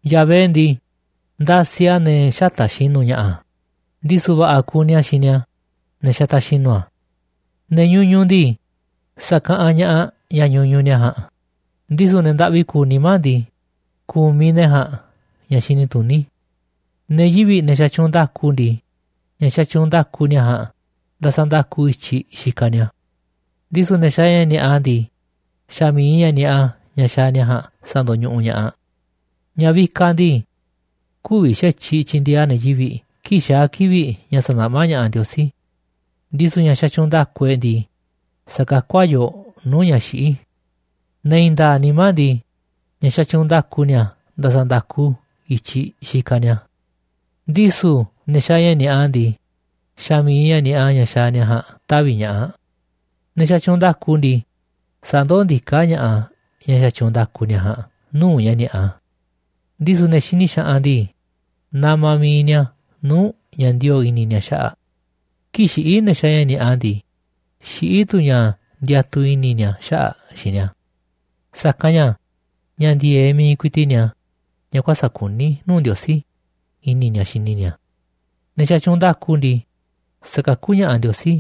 Yahvé ndii, ndasiꞌ a̱ ne̱ xätaꞌ xinu̱ ña̱ꞌa̱, ndisu̱ va̱ꞌa̱ kuni a̱ xini a̱ ne̱ xataꞌ xinu̱ a̱. Ne̱ ñuñuꞌ ndii, sa̱kaꞌanꞌ ña̱ꞌaꞌ ña̱ ñuñuꞌ ni̱a̱ ja̱a̱nꞌ, ndisu̱ ne̱ ndaꞌvi kuuꞌ nimá ndii, kumiꞌ ne̱ ja̱a̱nꞌ ña̱ xini tuní. Ne̱ yivi̱ꞌ, ne̱ xatyuunꞌ nda̱ku ndii, ña̱ xatyuunꞌ nda̱ku ni̱a̱ ja̱a̱nꞌ ndasanda̱ku i̱tyiꞌ xikaꞌ ni̱a̱, ndisu̱ ne̱ xaaꞌ ña̱ ni̱a̱ꞌa ndii, xa̱ mi̱iꞌ ña̱ ni̱a̱ꞌa ña̱ xaaꞌ ni̱a̱ ja̱a̱nꞌ sa̱ndo̱ñuꞌuꞌ ña̱ꞌaꞌ. Ña̱ vikaꞌ ndii, kü̱vi̱ xa̱tyiꞌ tyi̱ndi̱e̱eꞌ a̱ ne̱ yivi̱ꞌ kii̱ꞌ xaa̱ kivi̱ꞌ ña̱ sa̱naꞌmá ña̱ꞌaꞌ Ndiosí, ndisu̱ ña̱ xatyuunꞌ nda̱ku e̱ꞌ ndii, sa̱kakú a̱ yooꞌ nuu̱ꞌ ña̱ xiꞌí. Ne̱ i̱i̱n nda̱a̱ꞌ nimá ndii, ña̱ xatyuunꞌ nda̱ku ni̱a̱ ndasanda̱ku i̱tyiꞌ xikaꞌ ni̱a̱, ndisu̱ ne̱ xaaꞌ ña̱ ni̱a̱ꞌa ndii, xa̱ mi̱iꞌ ña̱ ni̱a̱ꞌa ña̱ xaaꞌ ni̱a̱ ja̱a̱nꞌ tavi̱ ña̱ꞌaꞌ. Ne̱ xatyuunꞌ nda̱ku ndii, sandoó ndiká ña̱ꞌaꞌ ña̱ xatyuunꞌ nda̱ku ni̱a̱ ja̱a̱nꞌ nuu̱ꞌ ña̱ ni̱a̱ꞌa, ndisu̱ ne̱ xini xaꞌanꞌ ndii, namaꞌ mi̱iꞌ ni̱a̱ nuu̱ꞌ ña̱ ndioo̱ꞌ i̱ni̱ ni̱a̱ xaꞌa̱ꞌ. Kii̱ꞌ xiꞌí ne̱ xaaꞌ ña̱ ni̱a̱ꞌa ndii, xiꞌí tu̱ ña̱ ndiatuꞌ i̱ni̱ ni̱a̱ xaꞌa̱ꞌ xiinꞌ ni̱a̱. Sa̱kanꞌ ña̱ ña̱ ndi̱e̱eꞌ mi̱iꞌ ku̱i̱ti̱ꞌ ni̱a̱, ña̱ kuäsa̱ꞌ kuní nuu̱ꞌ Ndiosí, i̱ni̱ ni̱a̱ xini ni̱a̱. Ne̱ xatyuunꞌ nda̱ku ndii, sakakú ña̱ꞌaꞌ Ndiosí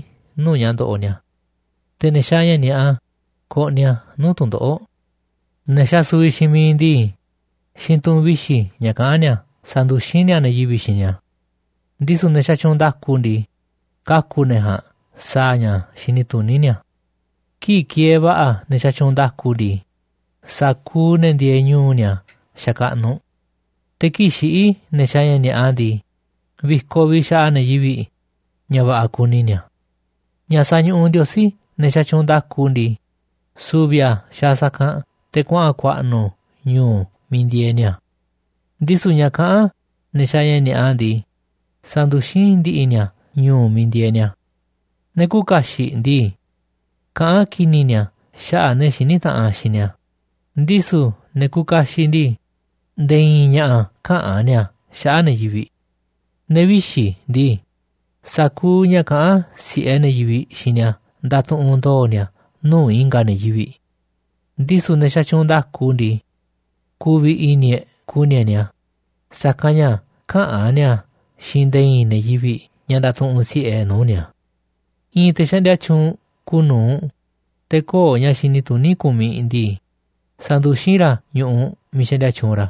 nuu̱ꞌ ña̱ ndoꞌoꞌ ni̱a̱. Te̱ ne̱ xaaꞌ ña̱ ni̱a̱ꞌa koꞌniꞌ a̱ nuu̱ꞌ tu̱ndoꞌo̱ꞌ. Ne̱ xasuviꞌ xiinꞌ miiꞌ ndii, xiinꞌ tu̱ꞌu̱n vixi̱ ña̱ kaꞌán ni̱a̱ sanduxín ni̱a̱ ne̱ yivi̱ꞌ xiinꞌ ni̱a̱, ndisu̱ ne̱ xatyuunꞌ nda̱ku ndii, kaku̱ ne̱ ja̱a̱nꞌ sa̱a̱ ña̱ xini tuní ni̱a̱. Kii̱ꞌ kieeꞌ va̱ꞌa̱ ne̱ xatyuunꞌ nda̱ku ndii, sa̱kuuꞌ ne̱ ndieeꞌ ñu̱u̱ ni̱a̱ xakaꞌnuꞌ. Te̱ kii̱ꞌ xiꞌí ne̱ xaaꞌ ña̱ ni̱a̱ꞌa ndii, vi̱koꞌ vi̱ꞌ xaꞌa ne̱ yivi̱ꞌ ña̱ va̱ꞌa̱ kuni ni̱a̱. Ña̱ sañuꞌuꞌ Ndiosí ne̱ xatyuunꞌ nda̱ku ndii, su̱vi̱ a̱ xaaꞌ sa̱kanꞌ te̱ kuaꞌa̱n ku̱a̱ꞌnu̱ ñu̱u̱ miiꞌ ndieeꞌ ni̱a̱, ndisu̱ ña̱ kaꞌán ne̱ xaaꞌ ña̱ ni̱a̱ꞌa ndii, sanduxín ndi̱ꞌi̱ ni̱a̱ ñu̱u̱ miiꞌ ndieeꞌ ni̱a̱. Ne̱ küuꞌ kaxiꞌ ndii, kaꞌán ki̱ni̱ ni̱a̱ xaꞌa̱ꞌ ne̱ xiní taꞌanꞌ xiinꞌ ni̱a̱, ndisu̱ ne̱ kuuꞌ kaxiꞌ ndii, nde̱e̱ i̱i̱n ña̱ꞌa̱ käꞌán ni̱a̱ xaꞌa̱ꞌ ne̱ yivi̱ꞌ. Ne̱ vixi̱ ndii, sa̱kuuꞌ ña̱ kaꞌán si̱ꞌe ne̱ yivi̱ꞌ xiinꞌ ni̱a̱ ndatuꞌunꞌ ndo̱o̱ ni̱a̱ nuu̱ꞌ i̱nga̱ ne̱ yivi̱ꞌ, ndisu̱ ne̱ xatyuunꞌ nda̱ku ndii, ku̱vi̱ i̱ni̱ e̱ꞌ ku̱ni̱ e̱ꞌ ni̱a̱, sa̱kanꞌ ña̱ käꞌán ni̱a̱ xiinꞌ nde̱e̱ i̱i̱n ne̱ yivi̱ꞌ ña̱ ndatuꞌunꞌ si̱ꞌe e̱ꞌ nuu̱ꞌ ni̱a̱. I̱i̱n te̱ xaꞌndia tyuunꞌ kuuꞌ nu̱uꞌ, te̱ köo̱ꞌ ña̱ xini tuní kumiꞌ ndii, sanduxín ra̱ ñu̱ꞌuꞌ miiꞌ xaꞌndia tyuunꞌ ra̱,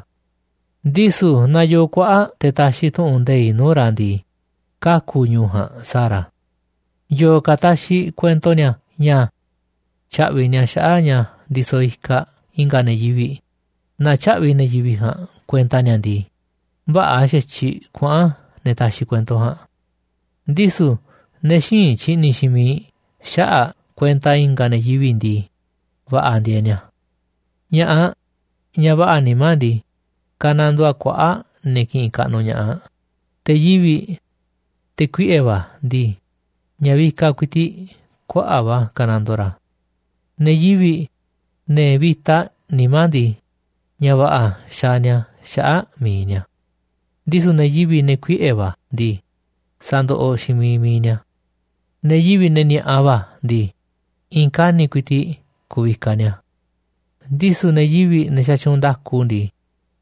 ndisu̱ naaꞌ yoo kuaꞌa̱ꞌ te̱ taxiꞌ tu̱ꞌu̱n nde̱iꞌ nuu̱ꞌ ra̱ ndii, kaku̱ ñu̱u̱ ja̱a̱nꞌ sa̱a̱ ra̱. Yo̱o̱ ka̱ taxiꞌ kuento ni̱a̱ ña̱ tya̱ꞌvi̱ ni̱a̱ xaꞌa̱ꞌ ña̱ ndisoꞌ ikaꞌ i̱nga̱ ne̱ yivi̱ꞌ, naaꞌ tyä̱ꞌvi̱ ne̱ yivi̱ꞌ ja̱a̱nꞌ kuenta ni̱a̱ ndii, vä̱ꞌa̱ xa̱tyiꞌ kuaꞌa̱n ne̱ taxiꞌ kuento ja̱a̱nꞌ, ndisu̱ ne̱ xïinꞌ tyi̱ꞌni̱ xiinꞌ miiꞌ xaꞌa̱ꞌ kuenta i̱nga̱ ne̱ yivi̱ꞌ ndii, va̱ꞌa̱ ndieeꞌ ni̱a̱. Ña̱ꞌaꞌ, ñaꞌ va̱ꞌa̱ nimá ndii, kanandoo aꞌ kuaꞌa̱ꞌ ne̱ kiꞌinꞌ kaꞌnuꞌ ña̱ꞌaꞌ, te̱ yivi̱ꞌ, te̱ kuiꞌe̱ va̱ ndii, ña̱ vikaꞌ ku̱i̱ti̱ꞌ kuaꞌa̱ꞌ va̱ kanandoo ra̱. Ne̱ yivi̱ꞌ, ne̱ vi̱ta nimá ndii, ña̱ va̱ꞌa̱ xaaꞌ ni̱a̱ xaꞌa̱ꞌ mi̱iꞌ ni̱a̱, ndisu̱ ne̱ yivi̱ꞌ, te̱ kuiꞌe̱ va̱ ndii, sandoꞌoꞌ xiinꞌ miiꞌ mi̱iꞌ ni̱a̱. Ne̱ yivi̱ꞌ, ne̱ ni̱a̱ꞌa va̱ ndii, i̱i̱n kani̱ꞌ ku̱i̱ti̱ꞌ ku̱vikaꞌ ni̱a̱, ndisu̱ ne̱ yivi̱ꞌ, ne̱ xatyuunꞌ nda̱ku ndii,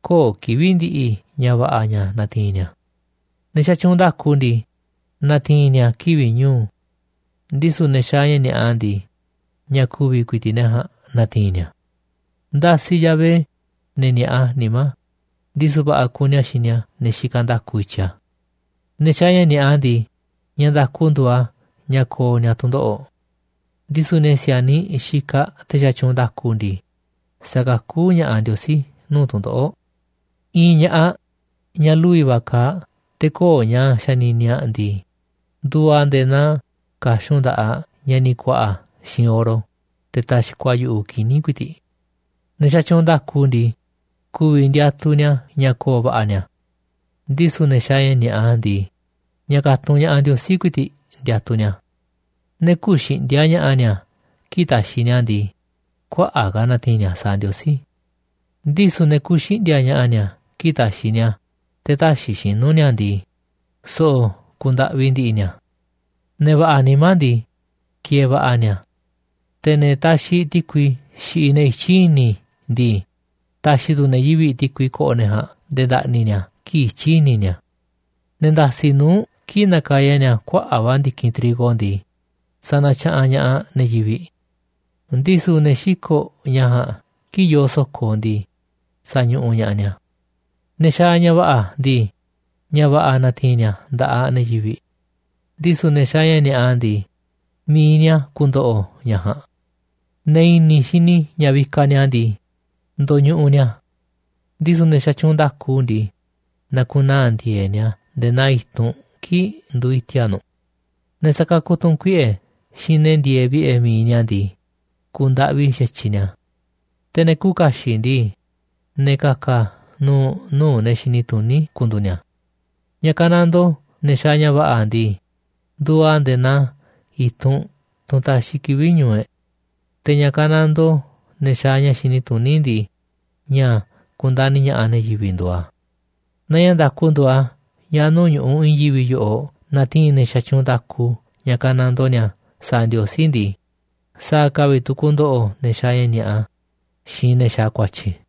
köo̱ꞌ kivi̱ꞌ ndi̱ꞌi̱ ña̱ va̱ꞌa̱ ña̱ na̱ti̱i̱n ni̱a̱. Ne̱ xatyuunꞌ nda̱ku ndii, na̱ti̱i̱n ni̱a̱ kivi̱ꞌ ñu̱u̱, ndisu̱ ne̱ xaaꞌ ña̱ ni̱a̱ꞌa ndii, ña̱ ku̱vi̱ ku̱i̱ti̱ꞌ ne̱ ja̱a̱nꞌ na̱ti̱i̱n ni̱a̱. Ndasiꞌ Yahvé ne̱ ni̱a̱ꞌa nimá, ndisu̱ va̱ꞌa̱ kuni a̱ xini a̱ ne̱ xikaꞌ nda̱ku i̱tyiꞌ a̱. Ne̱ xaaꞌ ña̱ ni̱a̱ꞌa ndii, ña̱ nda̱ku nduuꞌ a̱ ña̱ ko̱o̱ ni̱a̱ tu̱ndoꞌo̱ꞌ, ndisu̱ ne̱ si̱a̱niꞌ xikaꞌ te̱ xatyuunꞌ nda̱ku ndii, sa̱kakú ña̱ꞌaꞌ Ndiosí nuu̱ꞌ tu̱ndoꞌo̱ꞌ. I̱i̱n ña̱ꞌaꞌ, ñaꞌ lu̱vi̱ va̱ kaaꞌ, te̱ köo̱ꞌ ña̱ xanini aꞌ ndii, nduuꞌ aꞌ nde̱e̱ naa ka̱xun nda̱ꞌaꞌ ña̱ ni̱ ku̱a̱ꞌa̱ xiinꞌ oro, te̱ taxkoꞌ a̱ yu̱ꞌuꞌ kini̱ ku̱i̱ti̱ꞌ. Ne̱ xatyuunꞌ nda̱ku ndii, ku̱vi̱ ndiatuꞌ ni̱a̱ ña̱ ko̱o̱ va̱ꞌa̱ ni̱a̱, ndisu̱ ne̱ xaaꞌ ña̱ ni̱a̱ꞌa ndii, ña̱ ka̱tunꞌ ña̱ꞌaꞌ Ndiosí ku̱i̱ti̱ꞌ ndiatuꞌ ni̱a̱. Ne̱ küuꞌ xiꞌndi̱a̱ꞌ ña̱ꞌa̱ ni̱a̱ kii̱ꞌ taxiꞌ ni̱a̱ a̱ ndii, kuaꞌa̱ꞌ ka̱ a̱ na̱ti̱i̱n ni̱a̱ sa̱a̱ Ndiosí, ndisu̱ ne̱ kuuꞌ xiꞌndi̱a̱ꞌ ña̱ꞌa̱ ni̱a̱ kii̱ꞌ taxiꞌ ni̱a̱ a̱ te̱ täxiꞌ xinu̱ ni̱a̱ a̱ ndii, so̱ꞌo̱ kuuꞌ ndaꞌvi ndi̱ꞌi̱ ni̱a̱. Ne̱ va̱ꞌa̱ nimá ndii, ki̱e̱e̱ va̱ꞌa̱ ni̱a̱. Te̱ ne̱ taxiꞌ ti̱kui xiꞌiꞌ ne̱ i̱tyiꞌ i̱ni̱ ndii, ta̱xi̱ tu̱ ne̱ yivi̱ꞌ ti̱kui ko̱ꞌo̱ ne̱ ja̱a̱nꞌ nde̱e̱ nda̱ꞌni̱ ni̱a̱ kii̱ꞌ ityi̱ i̱ni̱ ni̱a̱. Ne̱ nda̱si̱ꞌ nuu̱ꞌ kii̱ꞌ nakaya ni̱a̱ kuaꞌa̱ꞌ va̱ ndi̱kinꞌ trigo ndii, sanatyaꞌanꞌ ña̱ꞌaꞌ ne̱ yivi̱ꞌ, ndisu̱ ne̱ xiko̱ꞌ ña̱ ja̱a̱nꞌ kii̱ꞌ yoo so̱ko̱ ndii, sañuꞌuꞌ ña̱ꞌaꞌ ni̱a̱. Ne̱ xaaꞌ ña̱ va̱ꞌa̱ ndii, ña̱ va̱ꞌa̱ natiinꞌ ni̱a̱ nda̱ꞌaꞌ ne̱ yivi̱ꞌ, ndisu̱ ne̱ xaaꞌ ña̱ ni̱a̱ꞌa ndii, mi̱iꞌ ni̱a̱ ku̱ndo̱ꞌo̱ ña̱ ja̱a̱nꞌ. Ne̱ i̱ni̱ xini ña̱ vikaꞌ ni̱a̱ ndii, ndo̱ñuꞌuꞌ ni̱a̱, ndisu̱ ne̱ xatyuunꞌ nda̱ku ndii, na̱ku̱naa̱ ndi̱e̱e̱ꞌ ni̱a̱ nde̱e̱ naa i̱tunꞌ kii̱ꞌ nduuꞌ iti̱a̱ꞌ nu̱ꞌ. Ne̱ sakakuꞌ tu̱ꞌu̱n kuiꞌe̱ xiinꞌ ne̱ ndieeꞌ vi̱ꞌe̱ mi̱iꞌ ni̱a̱ ndii, ku̱u̱ ndaꞌvi xa̱tyiꞌ ni̱a̱. Te̱ ne̱ küuꞌ kaxiꞌ ndii, ne̱ ka̱ka̱ nu̱u̱ nuu̱ꞌ ne̱ xini tuní ku̱ndu̱u̱ ni̱a̱. Ña̱ kanandoo ne̱ xaaꞌ ña̱ va̱ꞌa̱ ndii, nduuꞌ a̱ nde̱e̱ naa i̱tunꞌ, tunꞌ taxiꞌ kivi̱ꞌ ñu̱u̱ e̱ꞌ. Te̱ ña̱ kanandoo ne̱ xaaꞌ ña̱ xini tuní ndii, ña̱ ku̱ndani̱ ña̱ꞌaꞌ ne̱ yivi̱ꞌ nduuꞌ a̱. Naaꞌ ña̱ nda̱ku nduuꞌ a̱ ña̱ nuu̱ꞌ ñu̱ꞌuꞌ i̱i̱n yivi̱ꞌ yoꞌoꞌ natiinꞌ ne̱ xatyuunꞌ nda̱ku ña̱ kanandoo ni̱a̱ sa̱a̱ Ndiosí ndii, sa̱a̱ ka̱ vi̱ꞌ tu̱ ku̱ndo̱ꞌo̱ ne̱ xaaꞌ ña̱ ni̱a̱ꞌa xiinꞌ ne̱ xaaꞌ ku̱a̱tyi̱.